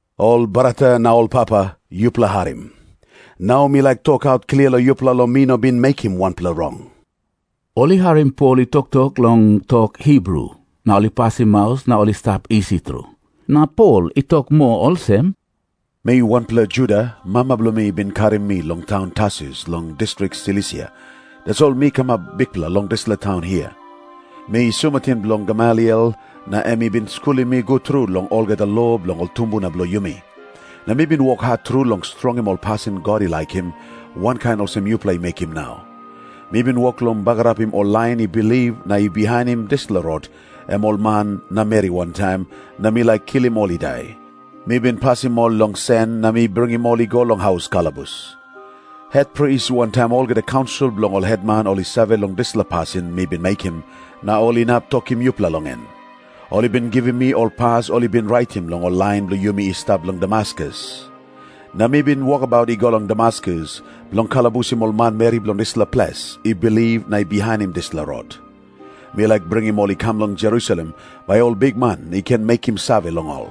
“Ol brata na ol papa, yupela harim. Nau mi laik tokaut klia long yupela long mi no bin mekim wanpela rong.” Ol i harim Pol i toktok long tok Hibru, na ol i pasim maus na ol i stap isi tru. Na Pol i tok moa olsem, “Mi wanpela Juda. Mama bilong mi i bin karim mi long taun Tarsus long distrik Silisia, tasol mi kamap bikpela long dispela taun hia. Mi sumatin bilong Gamaliel, na em i bin skulim mi gut tru long olgeta lo bilong ol tumbuna bilong yumi. Na mi bin wok hat tru long strongim ol pasin God i laikim, wankain olsem yupela i mekim nau. Mi bin wok long bagarapim ol lain i bilip na i bihainim dispela Rot, em ol man na meri wantaim, na mi laik kilim ol i dai. Mi bin pasim ol long sen na mi bringim ol i go long haus kalabus. Hetpris wantaim olgeta kaunsil bilong ol hetman ol i save long dispela pasin mi bin mekim, na ol inap tokim yupela long en. Ol i bin givim mi ol pas ol i bin raitim long ol lain bilong yumi i stap long Damaskus. Na mi bin wokabaut i go long Damaskus, bilong kalabusim ol manmeri bilong dispela ples i bilip na i bihainim dispela Rot. Mi laik bringim ol i kam long Jerusalem, bai ol bikman i ken mekim save long ol.”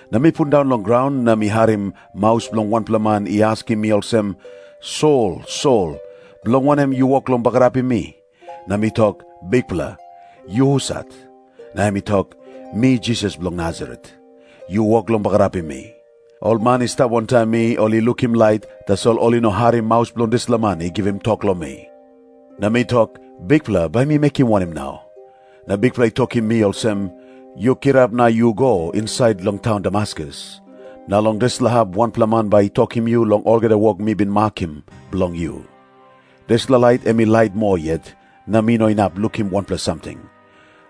Na mi pundaun long graun na mi harim maus bilong wanpela man i askim mi olsem, ‘Sol, Sol, bilong wanem yu wok long bagarapim mi?’ Na mi tok, ‘Bikpela, yu husat?’ Na em i tok, ‘Mi Jisas bilong Nasaret, yu wok long bagarapim mi.’ Ol man i stap wantaim mi ol i lukim lait, tasol ol i no harim maus bilong dispela man i givim tok long mi. “Na mi tok, ‘Bikpela, bai mi mekim wanem nau?’ Na Bikpela i tokim mi olsem, ‘Yu kirap na yu go insait long taun Damaskus. Na long dispela hap wanpela man bai i tokim yu long olgeta wok mi bin makim bilong yu.’ Dispela lait em i lait moa yet, na mi no inap lukim wanpela samting.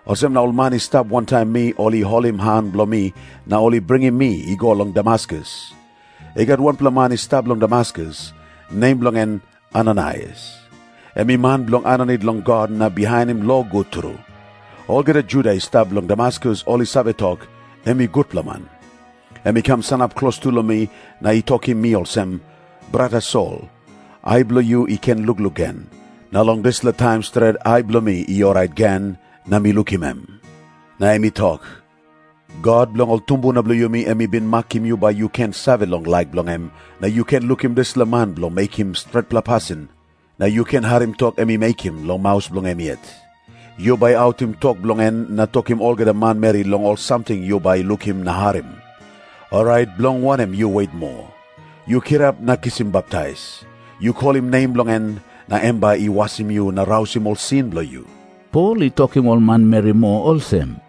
Olsem na ol man i stap wantaim mi ol i holim han bilong mi na ol i bringim mi i go long Damaskus. “I gat wanpela man i stap long Damaskus, nem bilong en Ananaias. Em i man bilong aninit long God na bihainim lo gut tru. Olgeta Juda i stap long Damaskus ol i save tok, em i gutpela man. Em i kam sanap klostu long mi na i tokim mi olsem, ‘Brata Sol, ai bilong yu i ken lukluk gen.’ Na long dispela taim stret ai bilong mi i orait gen, na mi lukim em. Na em i tok, ‘God bilong ol tumbuna bilong yumi em i bin makim yu bai yu ken save long laik bilong em, na yu ken lukim dispela Man bilong mekim stretpela pasin na yu ken harim tok em i mekim long maus bilong em yet. Yu bai autim tok bilong en na tokim olgeta manmeri long ol samting yu bai lukim na harim. Orait bilong wanem yu wet moa? Yu kirap na kisim baptais. Yu kolim nem bilong en, na em bai i wasim yu na rausim ol sin bilong yu.’” Pol i tokim ol manmeri moa olsem,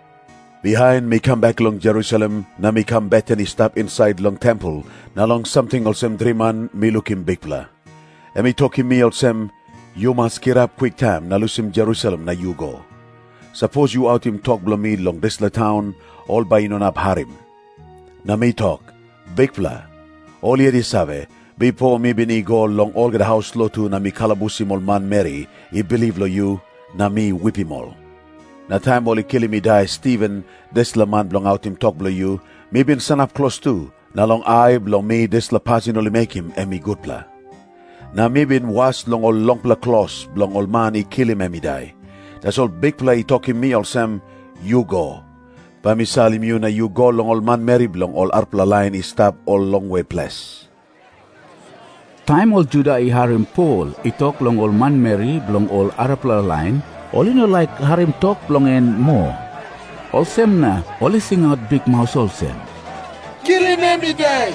“Bihain mi kam bek long Jerusalem, na mi kam beten i stap insait long tempel, na long samting olsem driman mi lukim Bikpela. Em i tokim mi olsem, ‘Yu mas kirap kwiktaim na lusim Jerusalem na yu go. Sapos yu autim tok bilong mi long dispela taun, ol bai i no inap harim.’ Na mi tok, ‘Bikpela, ol yet i save, bipo mi bin i go long olgeta haus lotu na mi kalabusim ol manmeri i bilip long yu, na mi wipim ol. Na taim ol i kilim i dai Stiven, dispela man bilong autim tok bilong yu, mi bin sanap klostu, na long ai bilong mi dispela pasin ol i mekim em i gutpela. Na mi bin was long ol longpela klos bilong ol man i kilim em i dai.’ Tasol Bikpela i tokim mi olsem, ‘Yu go. Bai mi salim yu na yu go long ol manmeri bilong ol arapela lain i stap ol longwe ples.’” Taim ol Juda i harim Pol i tok long ol manmeri bilong ol arapela lain, ol i no laik harim tok bilong en moa. Olsem na ol i singaut bikmaus olsem, “Kilim em i dai.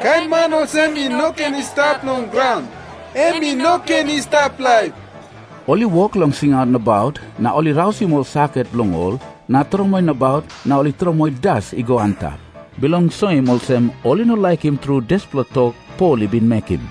Kain man olsem i no ken i stap long graun. Em i no ken i stap laip.” Ol i wok long singaut nabaut, na ol i rausim ol saket bilong ol na tromoi nabaut na ol i tromoi das i go antap, bilong soim olsem ol i no laikim tru dispela tok Pol i bin mekim.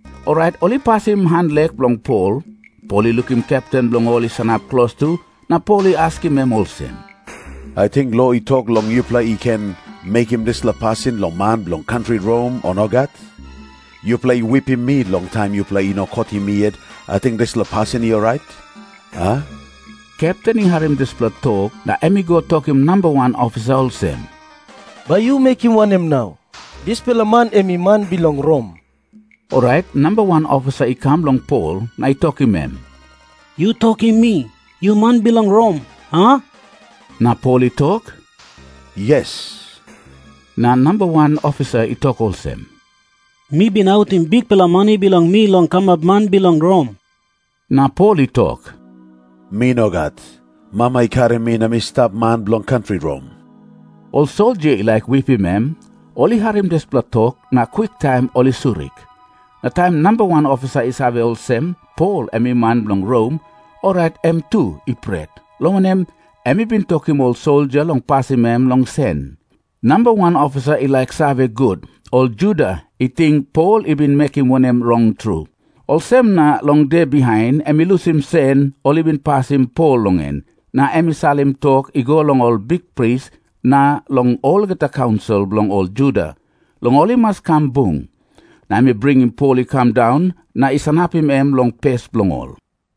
Orait ol i pasim hanlek bilong Pol. Pol i lukim kepten bilong ol i sanap klostu na Pol i askim em olsem, “Ating lo i tok long yupela i ken mekim dispela pasin long man bilong kantri Rom, o nogat? Yupela i wipim mi long taim yupela i no kotim mi yet, ating dispela pasin i orait, a?” Kepten i harim dispela tok, na em i go tokim namba wan ofisa olsem, “Bai yu mekim wanem nau? Dispela man em i man bilong Rom.” Orait namba wan ofisa i kam long Pol na i tokim em, “Yu tokim mi. Yu man bilong Rom, a?” Na Pol i tok, “Yes.” Na namba wan ofisa i tok olsem, “Mi bin autim bikpela mani bilong mi long kamap man bilong Rom.” Na Pol i tok, “Mi nogat. Mama i karim mi na mi stap man bilong kantri Rom.” Ol soldia i laik wipim em ol i harim dispela tok, na kwiktaim ol i surik. Na taim namba wan ofisa i save olsem, Pol em i man bilong Rom, orait em tu i pret, long wanem, em i bin tokim ol soldia long pasim em long sen. Namba wan ofisa i laik save gut, ol Juda i ting Pol i bin mekim wanem rong tru. Olsem na long de bihain em i lusim sen ol i bin pasim Pol long en, na em i salim tok i go long ol bikpris na long olgeta kaunsil bilong ol Juda, long ol i mas kam bung. Na em i bringim Pol i kam daun na i sanapim em long pes bilong ol.